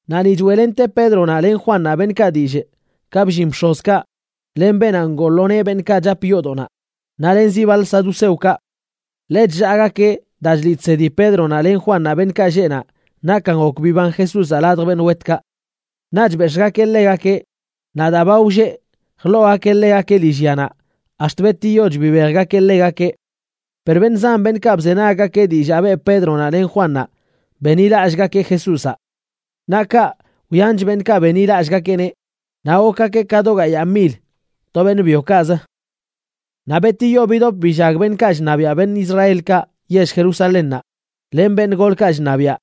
Naꞌ ni choeꞌlente Pédronaꞌ len Juannaꞌ beṉꞌkaꞌ dillꞌ ka bllin bx̱ozkaꞌ len beenaꞌ ngoo lo nee beṉꞌkaꞌ chap yoodoꞌnaꞌ naꞌ len zi baḻ saduceokaꞌ. Ḻe chllaagakeꞌ daa chliꞌ chsedi Pédronaꞌ len Juannaꞌ beṉꞌkaꞌ lleꞌ naꞌ nakan gok biban Jesúzaꞌ ladj beṉꞌ wetkaꞌ. Naꞌch bex̱ꞌgakeꞌ ḻegakeꞌ, naꞌ daa ba wlleꞌ, jḻoogakeꞌ ḻegakeꞌ lillyanaꞌ, ax̱t betiyoch bibejgakeꞌ ḻegakeꞌ. Per beṉꞌ zan beṉꞌkaꞌ bzenaggakeꞌ dillaa beꞌ Pédronaꞌ len Juannaꞌ benḻilallꞌgakeꞌ Jesúzaꞌ. Naꞌ kaꞌ, wyanch beṉꞌkaꞌ benḻilallꞌgakeꞌneꞌ, naꞌ gokgakeꞌ ka do gayaa mil to beṉꞌ byokaꞌzə. Naꞌ betiyo bidop billag beṉꞌkaꞌ chṉabiaꞌ beṉꞌ Israelkaꞌ yell Jerusalénnaꞌ, len beṉꞌ golkaꞌ chṉabiaꞌ,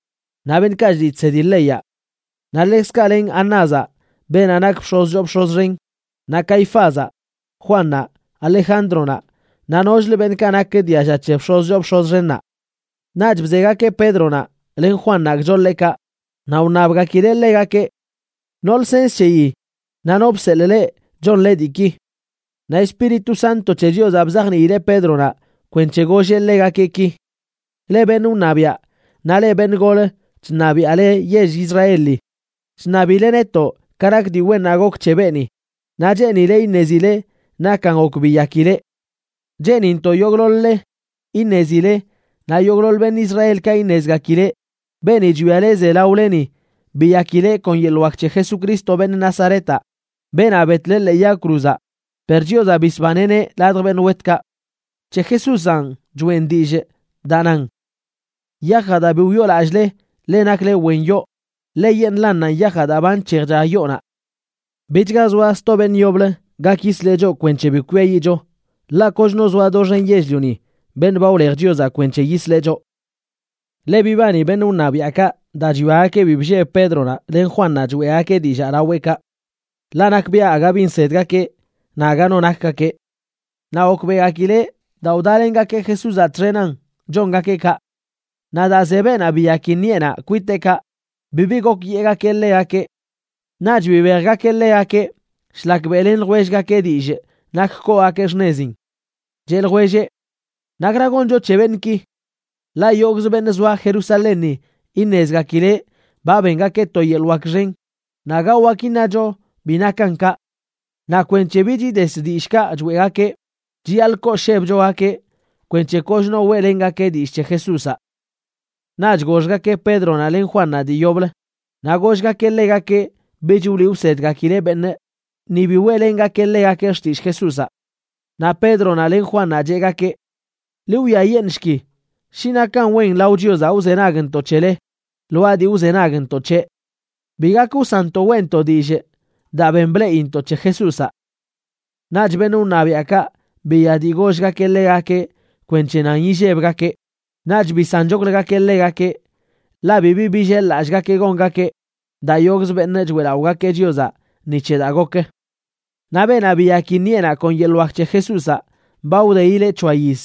naꞌ beṉꞌkaꞌ chliꞌ chsedi leyaꞌ. Naꞌ ḻekzkaꞌ len Anázaꞌ, beenaꞌ nak bx̱oz choo bx̱oz xen, naꞌ Caifázaꞌ, Juannaꞌ, Alejándronaꞌ, naꞌ nokchlə beṉꞌkaꞌ nak dialla c̱he bx̱oz choo bx̱oz xennaꞌ. Naꞌch bzegakeꞌ Pédronaꞌ len Juannaꞌ gchoḻeꞌkaꞌ, naꞌ wṉabgakileꞌ ḻegakeꞌ: ―¿No lsens c̱heyi naꞌ no bseḻꞌ leꞌ chonle diiki? Naꞌ Espíritu Santo c̱he Chiozaꞌ bzajniileꞌ Pédronaꞌ kwenc̱he golleꞌ ḻegakeꞌ ki: ―Leꞌ beṉꞌ wṉabiaꞌ, naꞌ leꞌ beṉꞌ gol chṉabiaꞌle yell Israeli, chṉabile netoꞌ ka nak dii wennaꞌ gok c̱he beeni, naꞌ cheenile iṉezile nakan gok biyakileꞌ. Cheenintoꞌ yogꞌḻoḻ-le iṉezile naꞌ yogꞌḻoḻ beṉꞌ Israelkaꞌ iṉezgakileꞌ, beeni chwiale ze laoleni biyakileꞌ kon yeḻꞌ wak c̱he Jesucristo, beṉꞌ Nazaretaꞌ, beenaꞌ betle ḻee yag cruzaꞌ, per Chiozaꞌ bisbaneꞌneꞌ ladj beṉꞌ wetkaꞌ. C̱he Jesúzanꞌ choeꞌn dillꞌ daa nan “yajaꞌ daa bi wyoolallꞌle leꞌ nakle wen yoo, ḻeyeṉꞌlannanꞌ yajaꞌ daa ba nc̱hejcha yoonaꞌ.” Bichga zoa sto beṉꞌ yoblə gak yisleꞌ choꞌ kwenc̱he bi kwiayiꞌcho. Ḻaꞌ kochno zoa doxen yell-lioni beṉꞌ ba wlej Chiozaꞌ kwenc̱he yisleꞌ choꞌ. Ḻe bibani beṉꞌ wṉabiaꞌkaꞌ daa chwiagakeꞌ bi blleb Pédronaꞌ len Juannaꞌ choeꞌgakeꞌ dillaa laweꞌkaꞌ, ḻaꞌ nakbiaꞌ aga bi nsedgakeꞌ naꞌ aga no nakgakeꞌ. Naꞌ gokbeꞌgakileꞌ daa wdalengakeꞌ Jesúzaꞌ txenan chongakeꞌ kaꞌ. Naꞌ daa ze beenaꞌ biyaki ṉiꞌenaꞌ kwiteꞌkaꞌ, bibi gok yeꞌgakeꞌ ḻegakeꞌ. Naꞌch bibejgakeꞌ ḻegakeꞌ shlak beꞌlen ljwellgakeꞌ dillꞌ nak koogakeꞌ xṉezin. Cheꞌ ljwelleꞌ: ―¿Nakra goncho c̱he beṉꞌki? Ḻaꞌ yogꞌzə beṉꞌ zoa Jerusalénni iṉezgakileꞌ ba bengakeꞌ to yeḻꞌ wak xen, naꞌ aga wak iṉacho bi nakan kaꞌ. Naꞌ kwenc̱he bich ides dillꞌkaꞌ choeꞌgakeꞌ, chiyaḻꞌ kooshebchogakeꞌ kwenc̱he kochno weꞌlengakeꞌ dillꞌ c̱he Jesúzaꞌ. Naꞌch goxgakeꞌ Pédronaꞌ len Juannaꞌ dii yoblə, naꞌ gollgakeꞌ ḻegakeꞌ bich wliꞌ wsedgakileꞌ beṉꞌ ni bi weꞌlengakeꞌ ḻegakeꞌ xtillꞌ Jesúzaꞌ. Naꞌ Pédronaꞌ len Juannaꞌ cheꞌgakeꞌ: ―Ḻi wwiayeṉꞌshki shi nakan wen lao Chiozaꞌ wzenagntoꞌ c̱hele lwaa dii wzenagntoꞌ c̱heꞌ. Bi gak wsanntoꞌ weꞌntoꞌ dillꞌ daa ben bleꞌintoꞌ c̱he Jesúzaꞌ. Naꞌch beṉꞌ wṉabiaꞌkaꞌ biya dii gollgakeꞌ ḻegakeꞌ kwenc̱he nan illebgakeꞌ, naꞌch bisanchokləgakeꞌ ḻegakeꞌ, ḻaꞌ bibi billel-lallꞌgakeꞌ gongakeꞌ daa yogꞌzə beṉꞌ choeꞌlaꞌogakeꞌ Chiozaꞌ ni c̱he daa gok. Naꞌ beenaꞌ biyaki ṉiꞌenaꞌ kon yeḻꞌ wak c̱he Jesúzaꞌ ba wdeileꞌ c̱hoa yiz.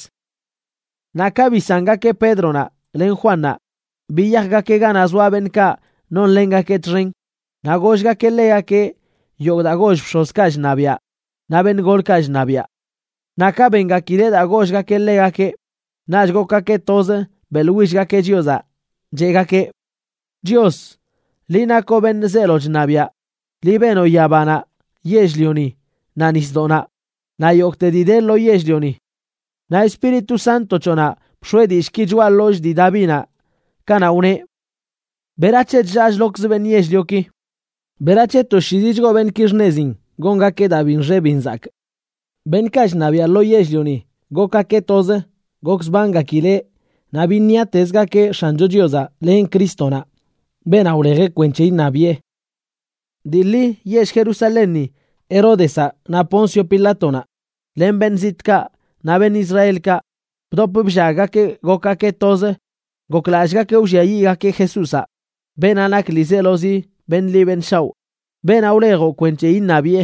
Naꞌ ka bisangakeꞌ Pédronaꞌ len Juannaꞌ, biyajgakeꞌ ganaꞌ zoa beṉꞌkaꞌ nonlengakeꞌ txen naꞌ gollgakeꞌ ḻegakeꞌ yogꞌ daa goll bx̱ozkaꞌ chṉabiaꞌ naꞌ beṉꞌ golkaꞌ chṉabiaꞌ. Naꞌ ka bengakileꞌ daa gollgakeꞌ ḻegakeꞌ, naꞌch gokgakeꞌ toz beꞌḻwillgakeꞌ Chiozaꞌ, cheꞌgakeꞌ: ―Chios, liꞌ nakoꞌ beṉꞌ zeelo chṉabiaꞌ. Liꞌ benoꞌ yabanaꞌ, yell-lioni, naꞌ nisdoꞌnaꞌ, naꞌ yogꞌte dii de lo yell-lioni. Naꞌ Espíritu Santo c̱hoꞌnaꞌ bx̱oeꞌ dillꞌki choꞌa ḻollꞌ dii Davinaꞌ kanaꞌ wneꞌ: ¿Berac̱he chllaa chlokz beṉꞌ yell-lioki? ¿Berac̱he toshiizi chgoo beṉꞌki xṉezin gongakeꞌ daa bi nxe bi nzakꞌ? Beṉꞌkaꞌ chṉabiaꞌ lo yell-lioni gokgakeꞌ toz gokzbangakileꞌ naꞌ biṉiatezgakeꞌ X̱ancho Chiozaꞌ len Crístonaꞌ, beenaꞌ wlejeꞌ kwenc̱he iṉabiꞌe. ’Dii ḻi yell Jerusalénni Heródezaꞌ naꞌ Poncio Pilátonaꞌ, len beṉꞌ zitꞌkaꞌ naꞌ beṉꞌ Israelkaꞌ, bdop bllaggakeꞌ gokgakeꞌ toz goklallꞌgakeꞌ wlliayiꞌgakeꞌ Jesúzaꞌ, beenaꞌ nak ḻiizelozi beṉꞌ ḻi beṉꞌ shaoꞌ, beenaꞌ wlejoꞌ kwenc̱he iṉabiꞌe.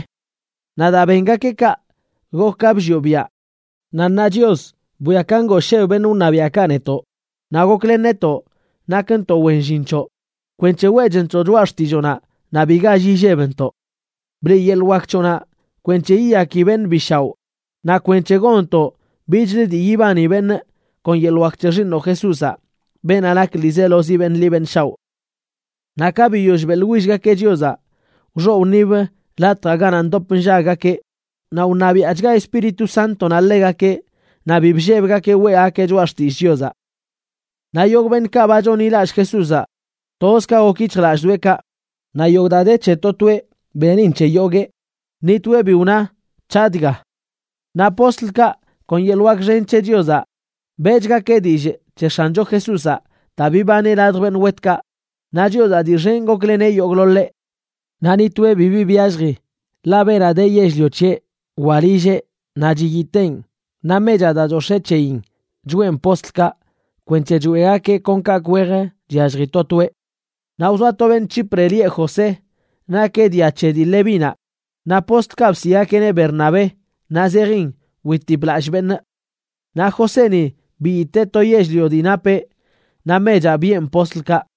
Naꞌ daa bengakeꞌ kaꞌ, gok ka bllioꞌ biaꞌ. Naꞌ ṉaa Chios, bwia ka ngoosheb beṉꞌ wṉabiaꞌkaꞌ netoꞌ, naꞌ goklen netoꞌ nakntoꞌ wen llin c̱hoꞌ, kwenc̱he weꞌchntoꞌ choꞌa xtilloonaꞌ naꞌ bi gall illebntoꞌ. Bliꞌ yeḻꞌ wak c̱hoꞌnaꞌ kwenc̱he yiyaki beṉꞌ bi shaoꞌ naꞌ kwenc̱he gonntoꞌ bichlə dii yibani beṉꞌ kon yeḻꞌ wak c̱he Xiiṉoꞌ Jesúzaꞌ, beenaꞌ nak ḻiizelozi beṉꞌ ḻi beṉꞌ shaoꞌ. Naꞌ ka biyoll beꞌḻwillgakeꞌ Chiozaꞌ, wxoꞌ wṉib latjaꞌ ganaꞌ ndop nllaggakeꞌ, naꞌ wṉabiaꞌchga Espíritu Sántonaꞌ ḻegakeꞌ naꞌ bi bllebgakeꞌ weꞌgakeꞌ choꞌa xtillꞌ Chiozaꞌ. Naꞌ yogꞌ beṉꞌkaꞌ ba chonḻilallꞌ Jesúzaꞌ, toz ka gok yic̱hjlallꞌdoꞌekaꞌ. Naꞌ yogꞌ daa de c̱he to toeꞌ, benin c̱he yoguee. Ni toeꞌ bi wna: “C̱haꞌ dga.” Naꞌ postlkaꞌ, kon yeḻꞌ wak xen c̱he Chiozaꞌ, beꞌchgakeꞌ dillꞌ c̱he X̱ancho Jesúzaꞌ daa bibaneꞌ ladj beṉꞌ wetkaꞌ, naꞌ Chiozaꞌ dii xen gokleneꞌ yogꞌḻoḻeꞌ. Naꞌ ni toeꞌ bibi byallji, ḻaꞌ beenaꞌ de yell-lio c̱heꞌ wa lilleꞌ naꞌ chiyiteen, naꞌ mechaꞌ daa chox̱ee c̱heyin choꞌen postlkaꞌ kwenc̱he choeꞌgakeꞌ kon kaꞌkꞌ wej chyallji to toeꞌ. Naꞌ wzoa to beṉꞌ Chipre lieꞌ José. Nakeꞌ dia c̱he dii Levínaꞌ, naꞌ postlkaꞌ bsiꞌgakeꞌneꞌ Bernabé, naꞌ zejin witip lallꞌ beṉꞌ. Naꞌ Joséni biyitee to yell-lio dii napeꞌ, naꞌ mechaꞌ biꞌen postlkaꞌ.